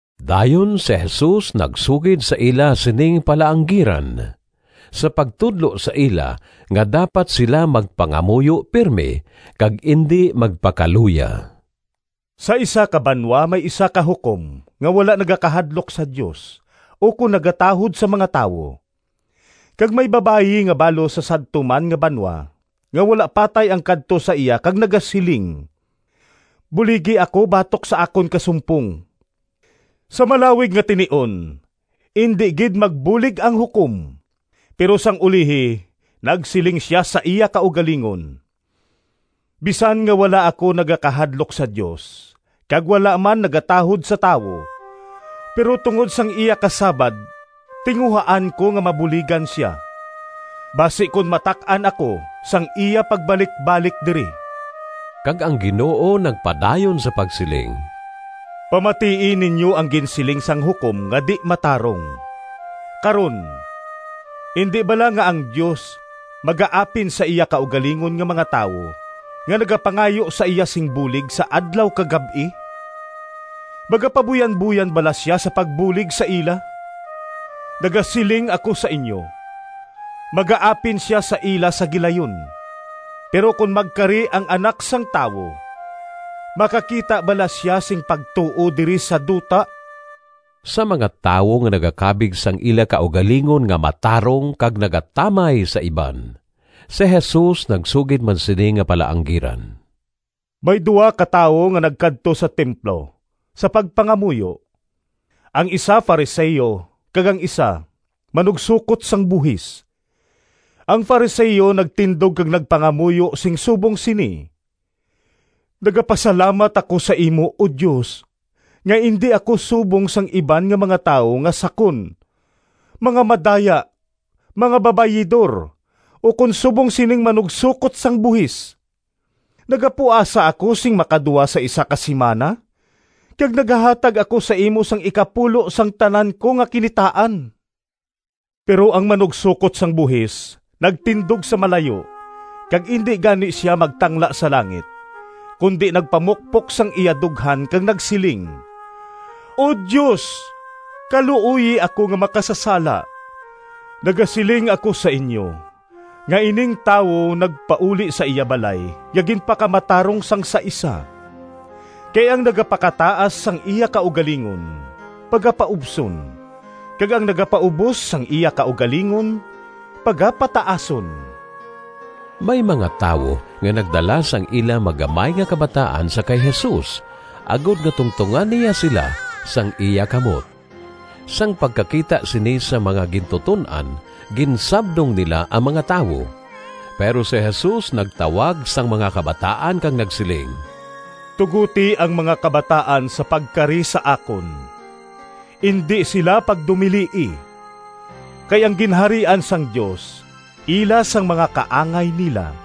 Dayon si Jesus nagsugid sa ila sining palaanggiran, sa pagtudlo sa ila nga dapat sila magpangamuyo pirme kag indi magpakaluya. “Sa isa ka banwa may isa ka hukom nga wala nagakahadlok sa Dios ukon nagatahod sa mga tawo. Kag may babayi nga balo sa sadto man nga banwa nga wala patay ang kadto sa iya kag nagasiling, ‘Buligi ako batok sa akon kasumpong.’ Sa malawig nga tinion indi gid magbulig ang hukom, pero sang ulihi nagsiling sia sa iya kaugalingon, ‘Bisan nga wala ako nagakahadlok sa Dios kag wala man nagatahod sa tawo, pero tungod sang iya kasabad tinguhaan ko nga mabuligan sia, basi kon matak-an ako sang iya pagbalikbalik diri.’” Kag ang Ginoo nagpadayon sa pagsiling, “Pamatii ninyo ang ginsiling sang hukom nga di-matarong. Karon, indi bala nga ang Dios magaapin sa iya kaugalingon nga mga tawo nga nagapangayo sa iya sing bulig sa adlaw kag gab-i? Magapabuyanboyan bala sia sa pagbulig sa ila? Nagasiling ako sa inyo, magaapin sia sa ila sa gilayon. Pero kon magkari ang Anak sang Tawo, makakita bala sia sing pagtuo diri sa duta?” Sa mga tawo nga nagakabig sang ila kaugalingon nga matarong kag nagatamay sa iban, si Jesus nagsugid man sini nga palaanggiran. “May duha ka tawo nga nagkadto sa templo sa pagpangamuyo. Ang isa Fariseo kag ang isa manugsokot sang buhis. Ang Fariseo nagtindog kag nagpangamuyo sing subong sini, ‘Nagapasalamat ako sa imo, O Dios, nga indi ako subong sang iban nga mga tawo nga sakon, mga madaya, mga babayidor, ukon subong sining manugsokot sang buhis. Nagapuasa ako sing makaduha sa isa ka simana, kag nagahatag ako sa imo sang ikapulo sang tanan ko nga kinitaan.’ Pero ang manugsokot sang buhis nagtindog sa malayo, kag indi gani sia magtangla sa langit, kundi nagpamukpok sang iya dughan kag nagsiling, ‘O Dios, kaluoyi ako nga makasasala!’ Nagasiling ako sa inyo nga ining tawo nagpauli sa iya balay nga ginpakamatarong sang sa isa. Kay ang nagapakataas sang iya kaugalingon pagapaubson, kag ang nagapaubos sang iya kaugalingon pagapataason.” May mga tawo nga nagdala sang ila magamay nga kabataan sa kay Jesus agod nga tungtongan niya sila sang iya kamot. Sang pagkakita sini sang mga gintuton-an ginsabdong nila ang mga tawo. Pero si Jesus nagtawag sang mga kabataan kag nagsiling, “Tugoti ang mga kabataan sa pagkari sa akon. Indi sila pagdumilii, kay ang Ginharian sang Dios ila sang mga kaangay nila.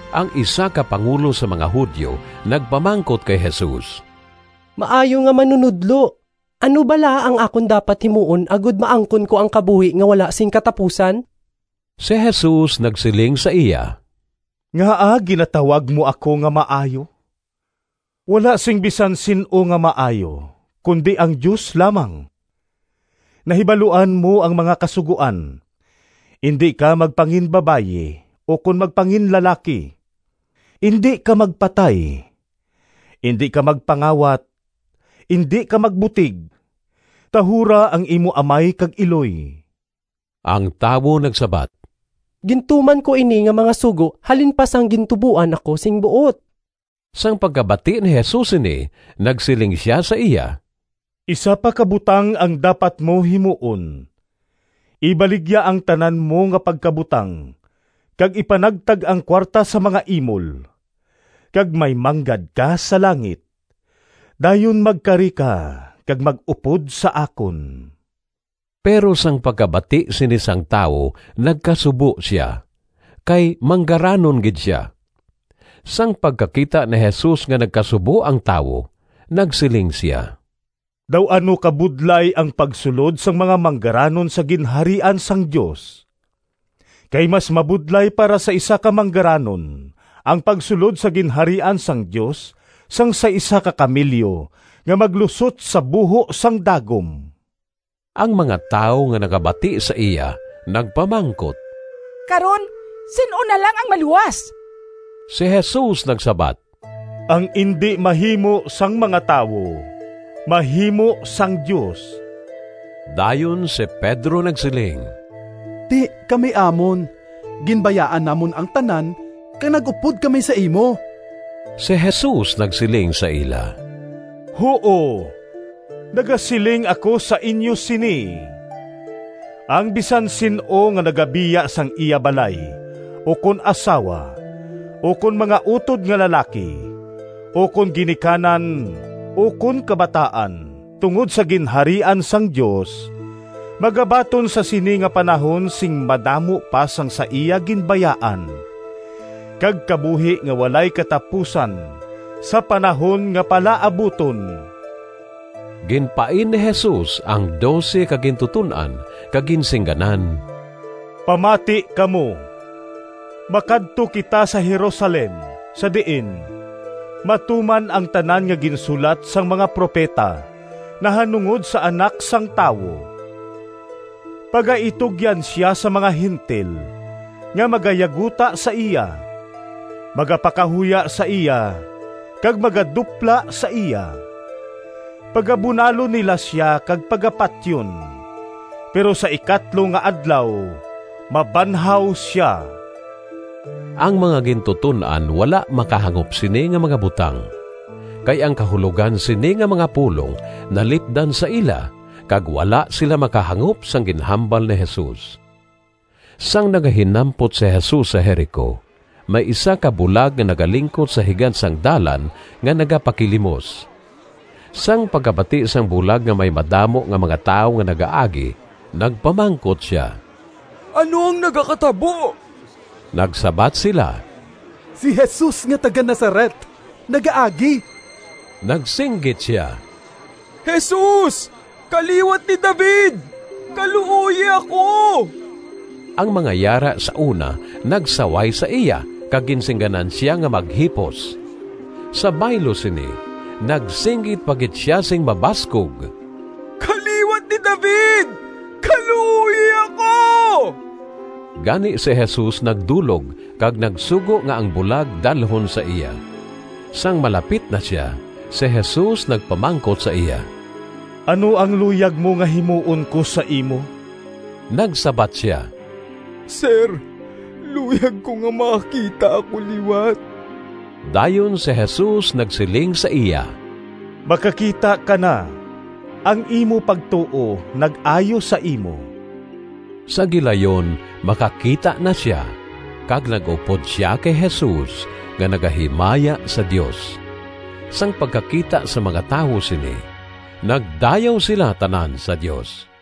Ang isa ka pangulo sang mga Judio nagpamangkot kay Jesus, “Maayo nga Manunodlo, ano bala ang akon dapat himuon agod maangkon ko ang kabuhi nga wala sing katapusan?” Si Jesus nagsiling sa iya, “Ngaa ginatawag mo ako nga maayo? Wala sing bisan sin-o nga maayo, kundi ang Dios lamang. Nahibaluan mo ang mga kasugoan, ‘Indi ka magpanginbabayi ukon magpanginlalaki, indi ka magpatay, indi ka magpangawat, indi ka magbutig, tahura ang imo amay kag iloy.’” Ang tawo nagsabat, “Gintuman ko ini nga mga sugo halin pa sang gintuboan ako sing buot.” Sang pagkabati ni Jesus sini nagsiling sia sa iya, “Isa pa ka butang ang dapat mo himuon. Ibaligya ang tanan mo nga pagkabutang kag ipanagtag ang kuwarta sa mga imol, kag may manggad ka sa langit. Dayon magkari ka kag mag-upod sa akon.” Pero sang pagkabati sini sang tawo nagkasubo sia, kay manggaranon gid sia. Sang pagkakita ni Jesus nga nagkasubo ang tawo, nagsiling sia, “Daw ano kabudlay ang pagsulod sang mga manggaranon sa Ginharian sang Dios! Kay mas mabudlay para sa isa ka manggaranon ang pagsulod sa Ginharian sang Dios sang sa isa ka kamelyo nga maglusot sa buho sang dagom.” Ang mga tawo nga nakabati sa iya nagpamangkot, “Karon, sin-o na lang ang maluwas?” Si Jesus nagsabat, “Ang indi mahimo sang mga tawo, mahimo sang Dios.” Dayon si Pedro nagsiling, “Ti, kami amon, ginbayaan namon ang tanan kag nag-upod kami sa imo.” Si Jesus nagsiling sa ila, “Huo, nagasiling ako sa inyo sini: ang bisan sin-o nga nagabiya sang iya balay ukon asawa ukon mga utod nga lalaki ukon ginikanan ukon kabataan tungod sa Ginharian sang Dios, magabaton sa sini nga panahon sing madamo pa sang sa iya ginbayaan, kag kabuhi nga walay katapusan sa panahon nga palaabuton.” Ginpain ni Jesus ang dose ka gintuton-an, kag ginsingganan, “Pamati kamo! Makadto kita sa Jerusalem sa diin matuman ang tanan nga ginsulat sang mga propeta nahanungod sa Anak sang Tawo. Pagaitugyan sia sa mga Gentil nga magayaguta sa iya, magapakahuya sa iya kag magadupla sa iya. Pagabunalon nila sia kag pagapatyon, pero sa ikatlo nga adlaw mabanhaw sia.” Ang mga gintuton-an wala makahangop sini nga mga butang, kay ang kahulogan sini nga mga pulong nalipdan sa ila kag wala sila makahangop sang ginhambal ni Jesus. Sang nagahinampot si Jesus sa Jerico, may isa ka bulag nga nagalingkod sa higad sang dalan nga nagapakilimos. Sang pagkabati sang bulag nga may madamo nga mga tawo nga nagaagi nagpamangkot sia, “Ano ang nagakatabo?” Nagsabat sila, “Si Jesus nga taga-Nazaret nagaagi.” Nagsinggit sia, “Jesus! Kaliwat ni David, kaluoyi ako!” Ang mga yara sa una nagsaway sa iya kag ginsingganan sia nga maghipos. Sa baylo sini, nagsinggit pa gid sia sing mabaskog, “Kaliwat ni David, kaluoyi ako!” Gani si Jesus nagdulog kag nagsugo nga ang bulag dalhon sa iya. Sang malapit na sia, si Jesus nagpamangkot sa iya, “Ano ang luyag mo nga himuon ko sa imo?” Nagsabat sia, “Sir, luyag ko nga makakita ako liwat.” Dayon si Jesus nagsiling sa iya, “Makakita ka na! Ang imo pagtuo nag-ayo sa imo.” Sa gilayon makakita na sia, kag nag-upod sia kay Jesus, nga nagahimaya sa Dios. Sang pagkakita sang mga tawo sini, nagdayaw sila tanan sa Dios.